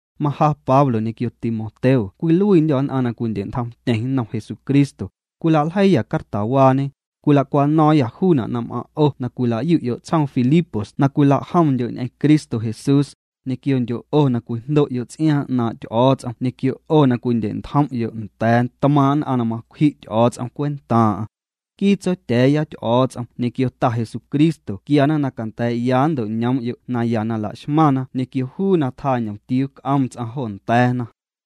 Maja Pablo ñequio Timoteo cwiluiindyô̱ nn'aⁿ na cwindye'ntjomtyeⁿ nnom Jesucristo, cwilaljeiiyâ cartawaañe, cwilacwano̱o̱ⁿyâ juuna' na m'aⁿ' 'o na cwila'yu'yo' tsjoom Filipos na cwila'jomndyo' ñ'eⁿ Cristo Jesús, ñequiondyo' 'o na cwijndo'yo' ts'iaaⁿ 'naaⁿ' Ty'o̱o̱ts'om ñequio 'o na cwindye'ntjom'yo' nda̱a̱ tmaaⁿ' nn'aⁿ na macwji' Ty'o̱o̱ts'om cwentaaⁿ'aⁿ. Nquii Tsotya̱a̱ya Ty'o̱o̱ts'om ñequio Ta Jesucristo quiana na canda̱a̱'ya nnto'ñoom'yo' naya na la'xmaⁿna ñequio juu na tjaa ñomtiuu c'oom ts'aⁿ jo nda̱a̱na.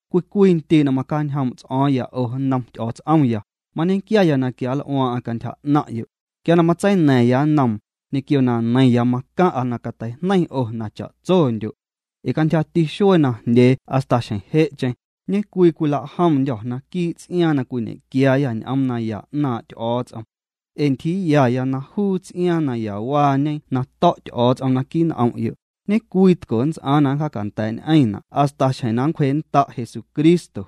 Cwii cwii ndii' na macjaañjoom' ts'o̱o̱ⁿya 'o, nnom Ty'o̱o̱ts'omya, mañequiaya na quianl'uaaⁿ'aⁿ cantyja 'naⁿ'yo'. Quia na matseina̱ⁿya nnoom, ñequio na neiⁿya macaⁿ'a na cateijneiⁿ 'o na cha'tsondyo'. Ee cantyjati xuee najndyee hasta xjeⁿ je'cheⁿ, ñecwii cwila'jomndyô̱ naquii' ts'iaaⁿ na cwiñequiaayâ ñ'oom naya 'naaⁿ' Ty'o̱o̱ts'om. Ee ntyjiiyaya na juu ts'iaaⁿ nayawaañe na to̱' Ty'o̱o̱ts'om naquii' n'om'yo', ñe'cwii tco nnts'aaⁿ na nncjaacanda̱a̱'ñ'eⁿna' hasta xjeⁿ na nncwjee'nnda' Jesucristo.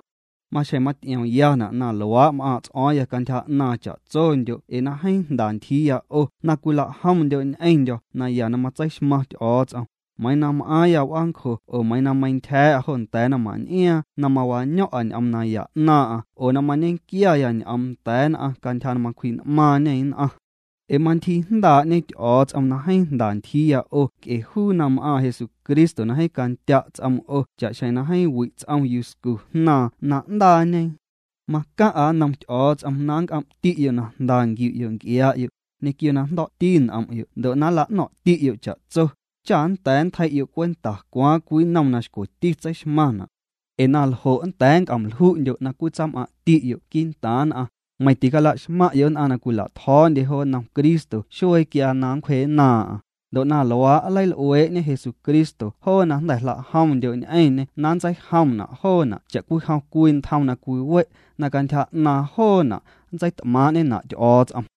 Maxjeⁿ maty'iomyana' na luaa' m'aaⁿ' ts'o̱o̱ⁿya cantyja 'naaⁿ cha'tsondyo' ee na jeeⁿ jnda ntyjiiya 'o na cwila'jomndyo' ñ'eⁿndyo̱ naya na matseixmaⁿ Ty'o̱o̱ts'om, meiiⁿ na m'aaⁿya w'aancjo oo meiiⁿ na meiⁿntyja̱a̱'a jo nda̱a̱ naⁿmaⁿn'iaaⁿ na mawaño̱ⁿ'a ñ'oom naya 'naaⁿ'aⁿ oo na mañequiaya ñ'oom nda̱a̱ nn'aⁿ cantyja na macwji'n'maaⁿñê nn'aⁿ. Ee mantyjiijndaa'ñe Ty'o̱o̱ts'om na jeeⁿ jnda ntyjiiya 'o nc'e juu na m'aaⁿ Jesucristo na jeeⁿ candya' ts'oom 'o cha'xjeⁿ na jeeⁿ wi' ts'om yuscu jnaaⁿ na 'ndaañe. Macaⁿ'a nnom Ty'o̱o̱ts'om na nnc'om'ti'yo' na jnda nquiu'yo' nc'iaa'yo', ñequio na jndo̱'ti n'om'yo' ndo' na nla'no̱ⁿ'ti'yo' cha'tso, cha nnda̱a̱ nntjei'yo' cwenta cwaaⁿ cwii nnom na xcweti tseixmaⁿna'. Ee na ljo' nnda̱a̱ nnc'om lju'ndyo' na cwitsam'aⁿ'ti'yo' quii'ntaaⁿ nn'aⁿ, meiⁿ ticalaxmaⁿ'yo' nn'aⁿ na cwila'tjo̱o̱ndye jo nnom Cristo xuee quia na nncwjee'nnaaⁿ'aⁿ, ndo' na luaa', nleil'uee'ñe Jesucristo joo na jnda̱ jla'jomndyo' ñ'eⁿñê na nntseijomna' joona' cha'cwijom cwii ntjom na cwiwe' na cantyja 'naaⁿ joona' nntseit'maaⁿ'ñena' Ty'o̱o̱ts'om.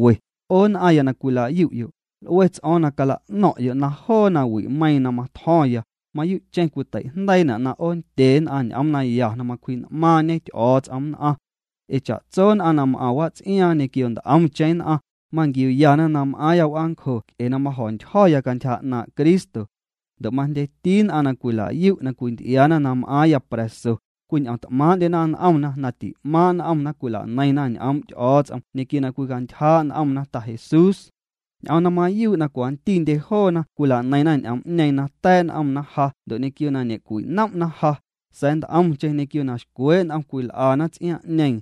'O nn'aⁿya na cwila'yu'yo', l'ue ts'o̱o̱ⁿ na cala'no̱ⁿ'yo' na joo nawi'meiiⁿ na matjo̱ⁿya, mayuu'cheⁿ cwiteijndeiina' na 'oonndye nn'aⁿ ñ'oom naya na macwji'n'maaⁿñe Ty'o̱o̱ts'om nn'aⁿ. Ee cha'tso nn'aⁿ na m'aⁿ wats'iaaⁿ ñequio nt'omcheⁿ nn'aⁿ, manquiuyana na m'aaⁿya w'aancjo nc'e na majo̱ntyjo̱ya cantyja 'naaⁿ' Cristo. Ndo' majndyeti nn'aⁿ na cwila'yu' na cwinty'iaana na m'aaⁿya pra̱so, cwin'omt'maaⁿ'ndyena n'omna na ti'maaⁿ' n'omna cwilaneiⁿna ñ'oom' Ty'o̱o̱ts'om ñequio na cwicantyjaa' n'omna Ta Jesús. Ñ'oom na mayuu' na cwantindye joona cwilaneiⁿna ñ'oom'ñeeⁿ na ta̱a̱' n'omna ja ndo' ñequio na ñe'cwinom'na ja, sa̱a̱ nt'omcheⁿ ñequio na xcwee' n'om cwil'ana ts'iaaⁿ'ñeeⁿ.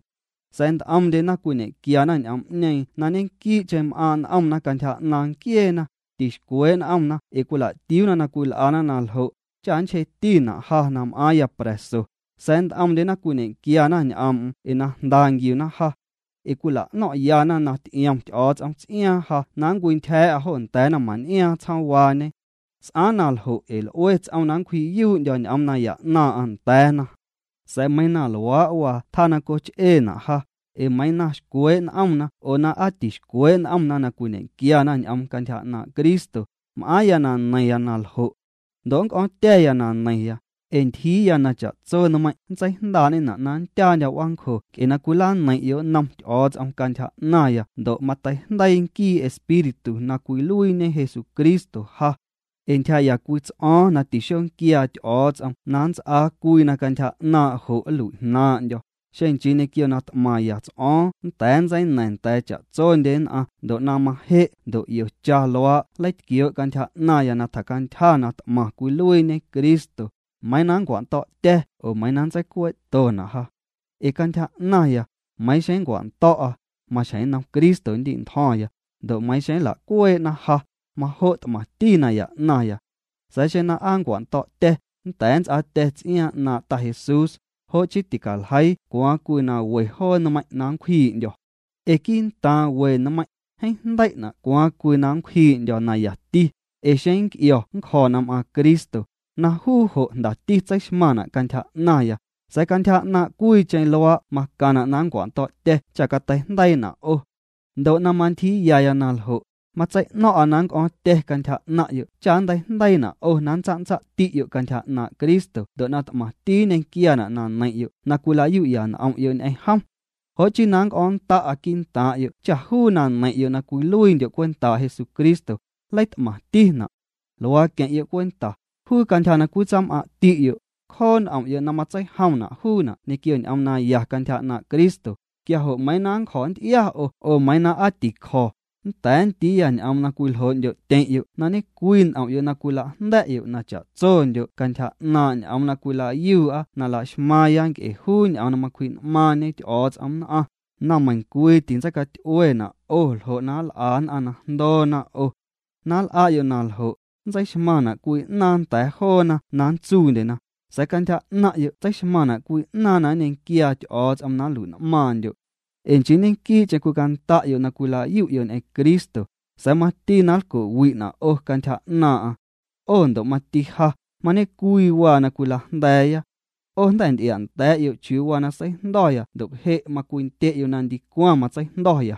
Sa̱a̱ nt'omndyena cwiñequiana ñ'oom'ñeeⁿ na ñequii'cheⁿ m'aaⁿ' n'omna cantyja 'naaⁿ nquieena, tixcwee' n'omna ee cwila'tiuuna na cwil'ana na ljo', cha nnchjeetina' ja na m'aaⁿya pra̱so, sa̱a̱ nt'omndyena cwiñe'quiana ñ'oom'm ee na jnda nquiuna ja. Ee cwila'no̱ⁿ'yana na ty'iom Ty'o̱o̱ts'om tis'aaⁿ ja na nncwintyja̱a̱'a jo nda̱a̱ naⁿmaⁿn'iaaⁿ tsjoomwaañe. S'aaⁿ na ljo' ee l'ue ts'oom na nncwji'yuu'ndyo̱ ñ'oom naya 'naaⁿ'aⁿ nda̱a̱na. Sa̱a̱ meiiⁿ na luaa' waa tjaa na coch'eena' ja, ee meiiⁿ na xcwee' n'omna oo na aa tixcwee' n'omna na cwiñequiana ñ'oom cantyja 'naaⁿ' Cristo, m'aaⁿya na neiⁿya na ljo'. Ndo' nnc'o̱o̱ⁿtya̱ya na neiⁿya, ee ntyjiiya na cha'tso nmeiiⁿ' nntseijndaa'ñena' na nndyaandyo̱ w'aancjo nc'e na cwilaneiⁿ'yo' nnom Ty'o̱o̱ts'om cantyja 'naⁿya ndo' na mateijndeii nquii Espíritu na cwiluiiñe Jesucristo ja. Ee ntyjaa'ya cwii ts'o̱o̱ⁿ na tixonquiaa Ty'o̱o̱ts'om na nnts'aa cwii na cantyja 'naaⁿ' jo' nlui'jnaaⁿ'ndyo̱, xeⁿ nchii ñequio na t'maⁿya ts'o̱o̱ⁿ nnda̱a̱ nntseina̱ⁿ nda̱a̱ cha'tsondye nn'aⁿ ndo' na maje' ndo' 'iocha luaa' nleitquioo' cantyja 'naⁿya na tjacantyja na t'maⁿ cwiluiiñe Cristo, meiiⁿ na nncwando̱'tya̱ oo meiiⁿ na nntseicuee'tona' ja. Ee cantyja 'naⁿya, meiiⁿ xeⁿ nncwando̱'a, maxjeⁿ nnom Cristo nndi'ntjo̱ⁿya, ndo' xeⁿ nla'cuee'na ja, majo' t'maⁿti naya 'naⁿya. Sa̱a̱ xeⁿ na aa nncwando̱'tya̱ nnda̱a̱ nnts'aatya̱ ts'iaaⁿ 'naaⁿ' Ta Jesús, jo' chii ticaljeii cwaaⁿ cwii na we joo nmeiⁿ' na nncwjii'ndyo̱. Ee quii'ntaaⁿ we nmeiⁿ', jeeⁿ jndei'na' cwaaⁿ cwii na nncwjii'ndyo̱ nayati, ee xeⁿ nnc'io̱ nncjo̱ na m'aaⁿ Cristo, na juu jo' jndati tseixmaⁿna' cantyja 'naⁿya, sa̱a̱ cantyja 'naaⁿ' cwiicheⁿ luaa' macaⁿna' na nncwando̱'tya̱ cha cateijndeiina' 'o. Ndo' na mantyjiiyaya na ljo', matsei'no̱ⁿ'a na nnc'o̱ⁿtya̱ cantyja 'naⁿ'yo' cha nnteijndeiina' 'o na nntsatsati'yo' cantyja 'naaⁿ' Cristo ndo' na t'maⁿti nñequiaana' na neiⁿ'yo' na cwilayu'ya n'om'yo' ñ'eⁿ jom. Jo' chii na nnc'o̱o̱ⁿnnda'a quii'ntaaⁿ'yo' cha juu na neiⁿ'yo' na cwiluiindyo' cwentaa' Jesucristo, nleit'maⁿtina'. Luaa queⁿ'yo' cwenta: juu cantyja na cwitsam'aⁿ'yo', cjoo' n'om'yo' na matseijomna' juuna' ñequio ñ'oom naya cantyja 'naaⁿ' Cristo, quia jo' meiiⁿ na nncjo̱ nnty'ia 'o oo meiiⁿ na aa ti'cjo̱, nnda̱a̱ nndiiya ñ'oom na cwiljoo'ndyo'tyeⁿ'yo' na ñe'cwii n'om'yo' na cwila'jnda̱'yo' na cha'tsondyo' cantyja 'naaⁿ' ñ'oom na cwila'yuu'a na la'xmaaⁿya nc'e juu ñ'oom na macwji'n'maaⁿñe Ty'o̱o̱ts'om nn'aⁿ, na meiⁿcwii tintseicaty'uena' 'o ljo' na nl'a nn'aⁿ na jndoona 'o. Na nl'a'yo' na ljo', nntseixmaⁿna' cwii 'naaⁿ nda̱a̱ joona na nntsuundyena, sa̱a̱ cantyja 'naⁿ'yo' tseixmaⁿna' cwii 'naaⁿ na nñequiaa Ty'o̱o̱ts'om na nlui'n'maaⁿndyo'. Ee nchii ñequii'cheⁿ cwicanda'yo' na cwila'yu'yo' ñ'eⁿ Cristo, sa̱a̱ mati na lco'wi'na' 'o cantyja 'naaⁿ'aⁿ. 'O ndo' mati ja mañe'cwii waa na cwila'jnda̱a̱'ya. 'O jnda̱ nty'ia'nda̱a̱'yo' chiuu waa na seijndo̱ya ndo' je' macwindye'yo' na ndicwaⁿ matseijndo̱.